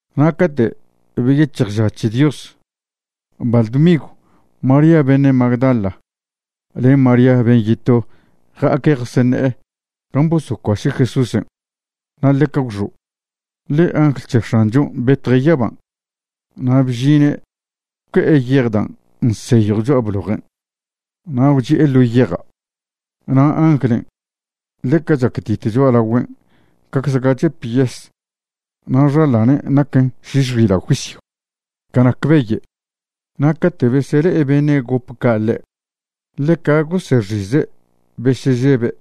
Na' cate' beyec̱hj ža c̱he Dios, baḻ dmigw María beṉe' Magdala len María ben' yeto ja'aque' jaseṉe'e gan' bosocuaše' Jesúsen'. Na' ḻeca gwxo', ḻe angl c̱he X̱anchon' betje' yaban', na' bžine' gwque'e yej dan' nseyjw cho'a blojen', na' gwchi'e ḻo yeja'. Na' anglen' ḻeca chactit cho'alagüen' cacze ga chep yes na' xaḻanen' naquen šiš xila' juisyw ca nac beye'. Na' cate' besele'e beṉe' gop ca' ḻe', ḻeca gosexize' besežebe'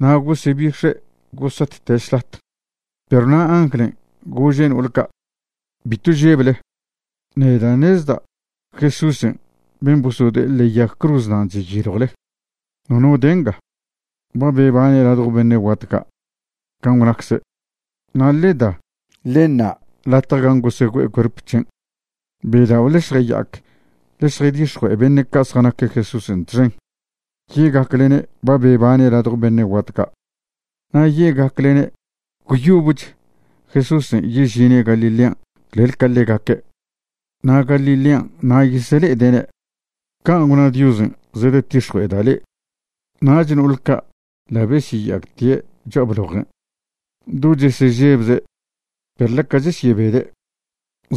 na' gosebix̱e' gosatte' šlat. Perw na' anglen' gože' no'ol ca': ―Bitw žeble. Neda' ṉezda' Jesúsen' ben' bosode'e ḻe'e yag cruz nan' cheyiljwle. Nono de nga. Ba bebane' ladjo beṉe' guat ca', can' gwnacze'. Na' ḻe da, ḻe ṉa' latje nga gan' gosegüe'e cuerp c̱hen'. Bedao' ḻe šjaya'ac ḻe šjaydix̱jue'e beṉe' ca' zjanaque' Jesúsen' txen ye'gaclene' ba bebane' ladjo beṉe' guat ca'. Na' ye'gaclene' gwyobech Jesúsen' yežine' Galilean' clel ca ḻegaque', na' Galilean' na' yesele'ede'ne'. Can' gwna Diosen' zedetix̱jue'eda' le'e. Nach no'ol ca' ḻa' besyeya'actie' cho'a blojen' do chesežebze' perw ḻeca chesyebede',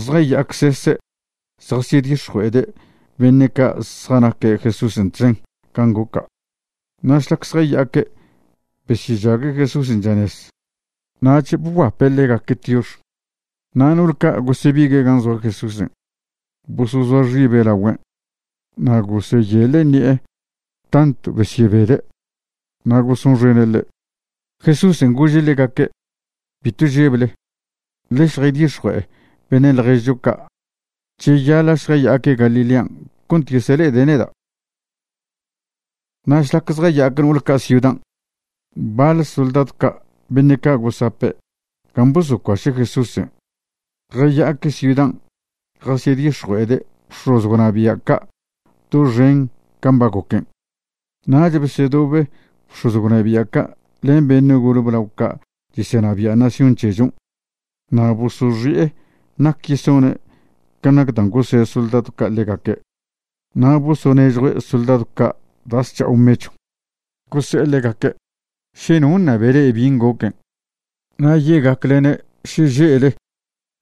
zjaya'acsese' zjasyedix̱jue'ede' beṉe' ca' zjanaque' Jesúsen' txen can' goca'. Na' šlac zjaya'aque' besyežague' Jesúsen' chanez. Nach bguape' ḻegaque' tiox. Na' no'ol ca' gosebigue' gan' zoa Jesúsen' bosozoa xibe' lagüen', na' goseyeḻe' ṉi'e tantw besyebede', na' gosonxene' ḻe'. Jesúsen' gože' ḻegaque': ―Bitw žeble. Ḻe šjaydix̱jue'e beṉe' ḻježcho ca', cheyaḻa' šjaya'aque' Galilean' cont yesele'ede' neda'. Na' šlac zjaya'ac no'ol ca' ciudan', baḻ soldadw ca' beṉe' ca' gosape' gan' bosocuaše' Jesúsen' jaya'aque' ciudan' jasyedix̱jue'ede' bx̱oz gwnabia' ca' doxen can' ba goquen'. Nach besedobe bx̱oz gwnabia' ca' len beṉe' gole blao ca' chesenabia' nación c̱hechon' na' bosoxi'e nac yesone' ca nac dan' gose' soldadw ca' ḻegaque'. Na' bosonežjue' soldadw ca' da' zc̱ha'o mechw. Gose'e ḻegaque': ―Še no ṉabe le'e bin' goquen', na' ye'gaclene' šeže'le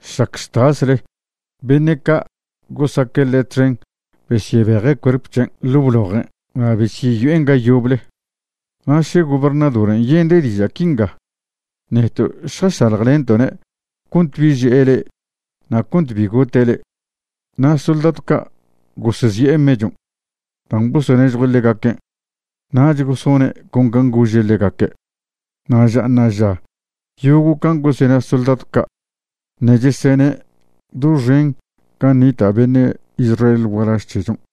šlac chtasle beṉe' ca' gosaque' ḻe' txen besyebeje' cuerp c̱hen' ḻo' blojen' na' besyeyo'en ga yoble. Na' še gobernadoren' yende' diža' quinga, neto' šjašaḻjlento'ne' cont bi že'e le'e na' cont bi gote' le'e. Na' soldadw ca' gosezi'e mechon' dan' bosonežjue' ḻegaquen', nach gosone' con can' gose'e ḻegaque'. Na' ža ṉa'aža yogo' can' gosena soldadw ca' ṉe' chesene' doxen gan' nita' beṉe' Israel gualaž c̱hechon'.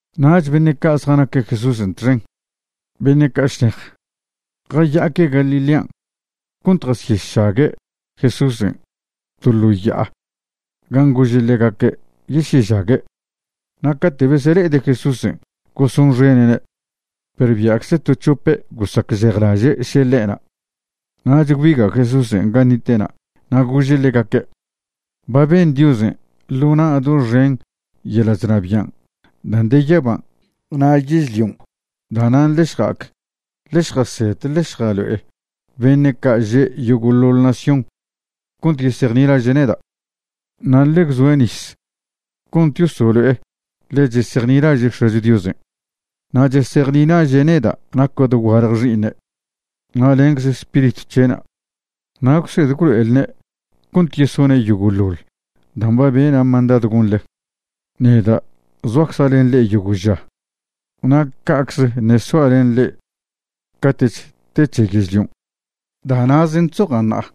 Nach beṉe' ca' zjanaque' Jesúsen' txen, beṉe' ca' šnej, jaya'aque' Galilean' cont jasyešague' Jesúsen' to ḻo ya'a gan' gože' ḻegaque' yesyežague'. Na' cate' besele'ede' Jesúsen' gosonxene'ne'. Perw bia'cze to c̱hope' gosacžejlaže' še ḻe'na'. Nach gwbiga' Jesúsen' gan' nite'na' na' gože' ḻegaque': ―Ba ben Diosen' ḻo na' doxen yeḻa' chnabian' dan' de yaban' na' yežlion'. Da'nan' ḻe šja'ac ḻe šjased ḻe šjalo'e beṉe' ca' že' yogo'ḻoḻ nación cont yesejnilaže' neda'. Na' ḻe gwzoe' nis cont yosolo'e ḻe chesejnilaže' X̱acho Diosen', na' chesejnilaže' neda' naca' dogualje Xi'iṉe', na' lencze Spiritw c̱he'na'. Na' gwsed gwlo'elne' cont yesone' yogo'ḻoḻ dan' ba bena' mandadw gonḻe. Neda' zoacza' len le'e yogo' ža, na' ca'cze ṉe' soa' len le'e cate'ch te c̱he yežlion'. Da' na'zen' chzoja' ṉa'a.